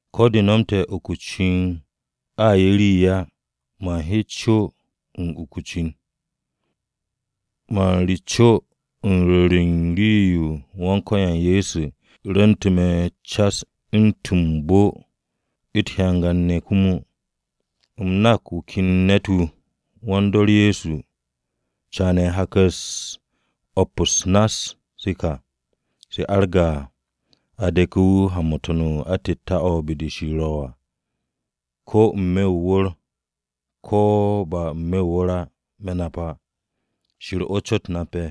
Ko̱ de nomte̱ uku o-cin a 'ye rii á, man he co u̱n uku o-cin. M-mo̱ka, man re co u̱n rwo̱r u̱n rii-yo Wan-Ko̱yan Ye̱so rwu̱nte̱ me̱ cas u̱ntu̱n m-bo u̱t-hyangan ne̱ komo. U̱m nak wu̱ ken ne̱t-wu̱, wan-dor Kiristi caane̱ hak-u̱s o̱p-u̱s nass-se ka, se arge̱ à, a de̱ke̱ wu̱ ha-mo̱ To̱n-o atette̱-o̱ be-de Shir ro̱ à. Ko̱ n-me̱ o-wu̱r o̱ ko̱ ba n-me̱ o-wu̱r á me̱ nap á, Shir o̱ cot nape̱.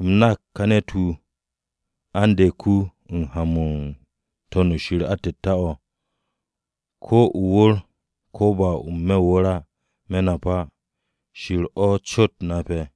U̱m nak ka ne̱t-wu̱, a u̱n de̱k wu̱ ha-mo̱ u̱n To̱n-o atette̱-o̱, ko̱ o-wu̱r ko̱ ba n-me̱ o-wu̱r á me̱ nap á, Shir o̱ cot nape̱.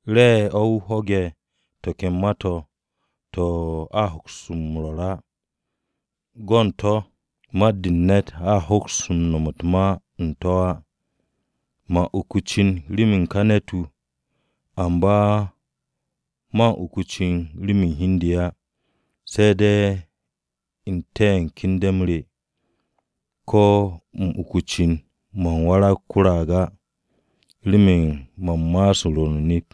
Re̱e̱ o̱ wu̱ ho̱ge̱ to̱ ken ma-to̱ to̱ a hoks m-rwo̱r á, go̱ u̱n to̱ mat-de u̱n ne̱t a hoks nom u̱t-ma u̱n to̱ á. Man uku o-cin remen ka ne̱t-wu̱, amba man uku o-cin remen hi u̱n de á, se̱ de̱ n-te̱ u̱n kende̱-m re. Ko̱ u̱m uku o-cin, man warag ko-raag á, remen man ma'as u̱n rwo̱r o-nip.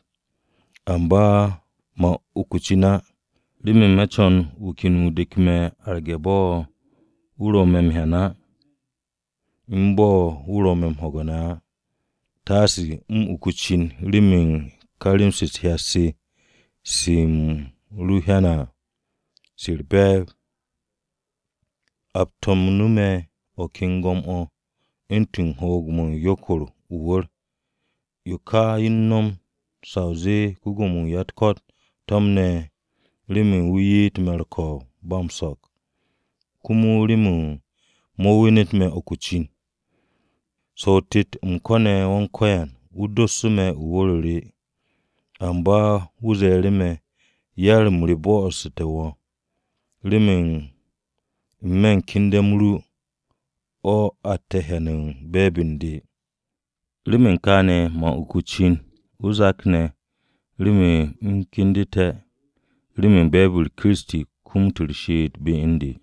Amba man uku o-cin á, remen me̱ co̱n wu̱ ken wu̱ dek me̱ arge̱ bo̱ wu̱ ro̱ me̱ m-hyan á, u̱n bo̱ wu̱ ro̱ me̱ m-ho̱ge̱ ne̱ á. Taase u̱m uku o-cin, remen ka rem-se u̱t-hyat se se u̱m hyane̱ à, se u̱r-be̱e̱b, a to̱mnu̱ me̱ o̱ ken go̱m-o̱ u̱ntu̱n hoog-mo̱ o-yokor o-wu̱r. Yo ka yo u̱n nom sa o zee wu̱ ko-Gwo̱mo-wu̱ u̱n ya-u̱t-ko̱t to̱mne̱ remen wu̱ ye'et me̱ u̱r-ko̱o̱b ba m-so̱k, komo remen mo̱ wenet me̱ uku o-cin à. So̱ o-tet u̱m ko̱ne̱ Wan-Ko̱yan wu̱ dossu̱ me̱ o̱ u̱n wu̱r-o re. Amba wu̱ ze̱e̱ru̱ me̱, “Yar-m re bo̱'o̱ssu̱te̱ wo̱, remen n-me̱ kende̱-m ru o̱ atte̱ m-hyan u̱n be̱e̱b u̱n de.” Remen kaane̱ man uku o-cin o-zak ne̱ remen u̱m kendu̱te̱ remen be̱e̱b-u̱r Kiristi kumut u̱r-she'et be u̱n de.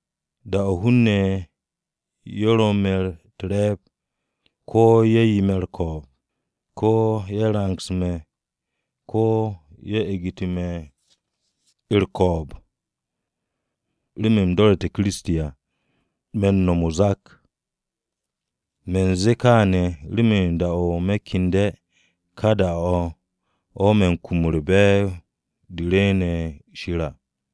Da-o̱ hun-ne̱ ye̱ ro me̱ u̱t-re̱e̱b, ko̱ ye̱ 'ye me̱ u̱r-ko̱o̱b, ko̱ ye̱ rangse̱ me̱, ko̱ ye̱ egnu̱tu̱ me̱ u̱r-ko̱o̱b remen u̱m do̱re̱ Kiristi à, me̱ m-no̱m o-zak. Me̱ u̱n ze̱e̱ kaane̱ remen da-o̱ me̱ kende̱ ka da-o̱ o̱ me̱ u̱n kum u̱r-be̱e̱b de rwu̱u̱ne̱ be-de Shir à.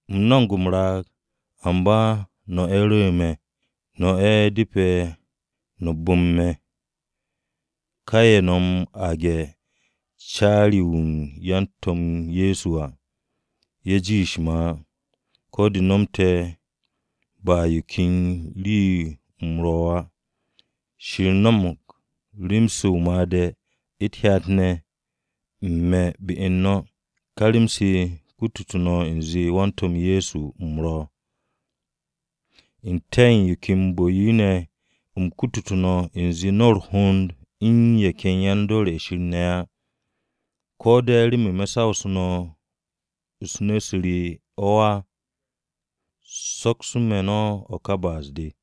U̱m no̱mo̱g m-raag, amba no̱ ye̱ rwo̱'u̱ me̱. No̱ ye̱ depe̱ no̱ bu̱m me̱. Ka ye̱ no̱ aage̱ “Caari-ye̱ u̱n yan-To̱m Ye̱so” à, ye̱ jiishe̱ me̱ á. Ko̱ de nomte̱ ba yo ken rii-yo u̱m ro̱ á. Shir no̱mo̱g rem-se o-made̱ u̱t-hyat ne̱ u̱n me̱ be u̱n no̱. Ka rem-se kutu̱ no̱ u̱nze wan-To̱m Ye̱so u̱m ro̱. ¿N-te̱ u̱n yo ke bu̱-yo ne̱ u̱m kutu no̱ u̱nze no̱ u̱r-hond u̱n ye̱ ken yan-dor ye̱ Shir ne̱ á? ¿Ko̱ de̱ remen me̱ sawsu̱ no̱ nu̱-u̱s re o̱ á? Soksu̱ me̱ no̱ ka ba'as-de!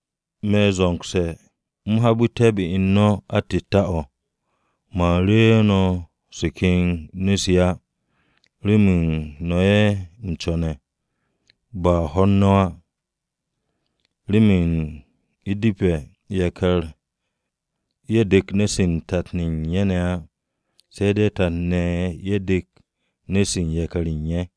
Me̱ zo̱ngse̱ u̱m habu̱té̱ be u̱n no̱ o̱ atette̱-o̱. Man ru̱'u̱ no̱ se ken nu̱-se á, remen no̱ ye̱ u̱m co̱ne̱, ba hwo̱r no̱ á. Remen u̱depe̱ yakar-ye̱ dek nu̱-se u̱n tat u̱n ye̱ ne̱ á se̱ de̱ tat-ne̱ ye̱ dek nu̱-se u̱n yakar-ye̱ u̱n ye̱.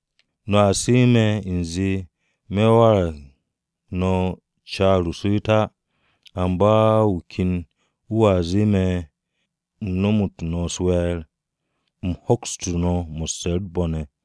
No̱a su̱'e̱ me̱ u̱nze me̱ warag no̱ o-caar o-su̱u̱t á. Amba wu̱ ken wu̱a zee me̱ u̱n no̱mo̱ no̱ u̱s-we̱e̱r, u̱m hokstu̱ no̱ mo̱sse̱ u̱t-bo̱ ne̱.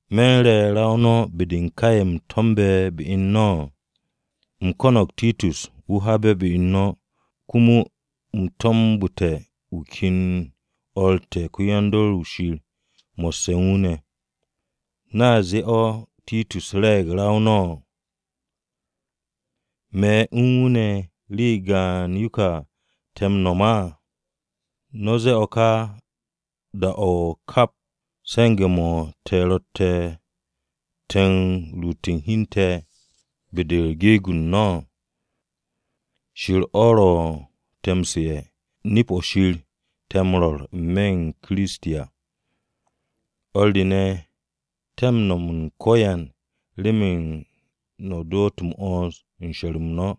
¿Me̱ u̱n re ra-o no̱ be-de u̱n ka ye̱ u̱m to̱mbe̱ be u̱n no̱? U̱m ko̱no̱g Titus wu̱ habe̱ be-u̱r no̱, komo u̱m to̱mbu̱te̱ wu̱ ken o̱r te̱ ko-yan-dor o̱ Shir mo̱sse̱ u̱n wu̱ ne̱. ¿No̱a zee o̱ Titus re̱e̱g ra-o no̱? ¿Me̱ u̱n wu̱ ne̱ rii gaan-yo ka te̱ m-no̱m á? No̱ m-ze̱e̱ o̱ ka da-o̱ kap, se̱nge̱-mo̱ te̱ ro̱tte̱ te̱ ruuté̱ hi u̱n te̱ be-de geeg-u̱r no̱. Shir o̱ ro̱ te̱ m-su̱'e̱, nip-o̱ Shir o̱ te̱ m-rwo̱r n-me̱ u̱n Kiristi à. O̱r re ne̱, te̱ m-no̱m u̱n ko̱yan remen no̱ doot m-'wo̱ns u̱n she̱r-m no̱.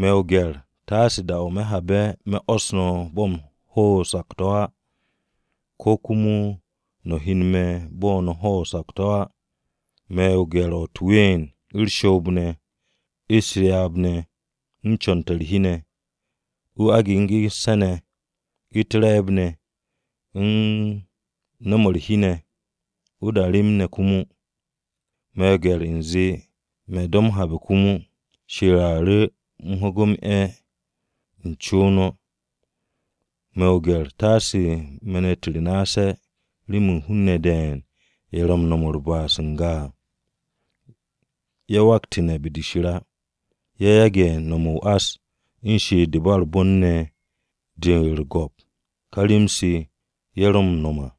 Me̱ o-gye̱r taase da-o̱ me̱ habe̱ u̱m 'wo̱s no̱ bo̱ u̱m hwo̱ o-sakto̱ á, ko̱ komo no̱ hyen me̱ bo̱ no̱ hwo̱ o-sakto̱ á. Me̱ o-gye̱r o̱ u̱t-ween, u̱r-shoob ne̱, u̱s-ryaab ne̱, u̱n co̱n-to̱ u̱r-hi ne̱, o-agegense̱ ne̱, u̱t-re̱e̱b ne̱, u̱n nu̱-mo̱ u̱r-hi ne̱, o-da rem ne̱ komo. Me̱ o-gye̱r u̱nze me̱ do̱ m-habe̱ komo, Shir a ru̱ u̱m ho̱ge̱ m-'e̱ u̱n co no̱. Me̱ o-gye̱r taase me̱n-u̱t re naase̱ remen hun-ne̱ de̱e̱n ye̱ ro̱ u̱n nom u̱r-ba'as n-ga à, ye̱ waktu̱ne̱ be-de Shir á, ye̱ yage̱ no̱mo̱ o-ás u̱n she'et-de u̱n ba u̱r-bon ne̱ de u̱r-go̱p ká rem-se ye̱ ro̱ m-no̱m à.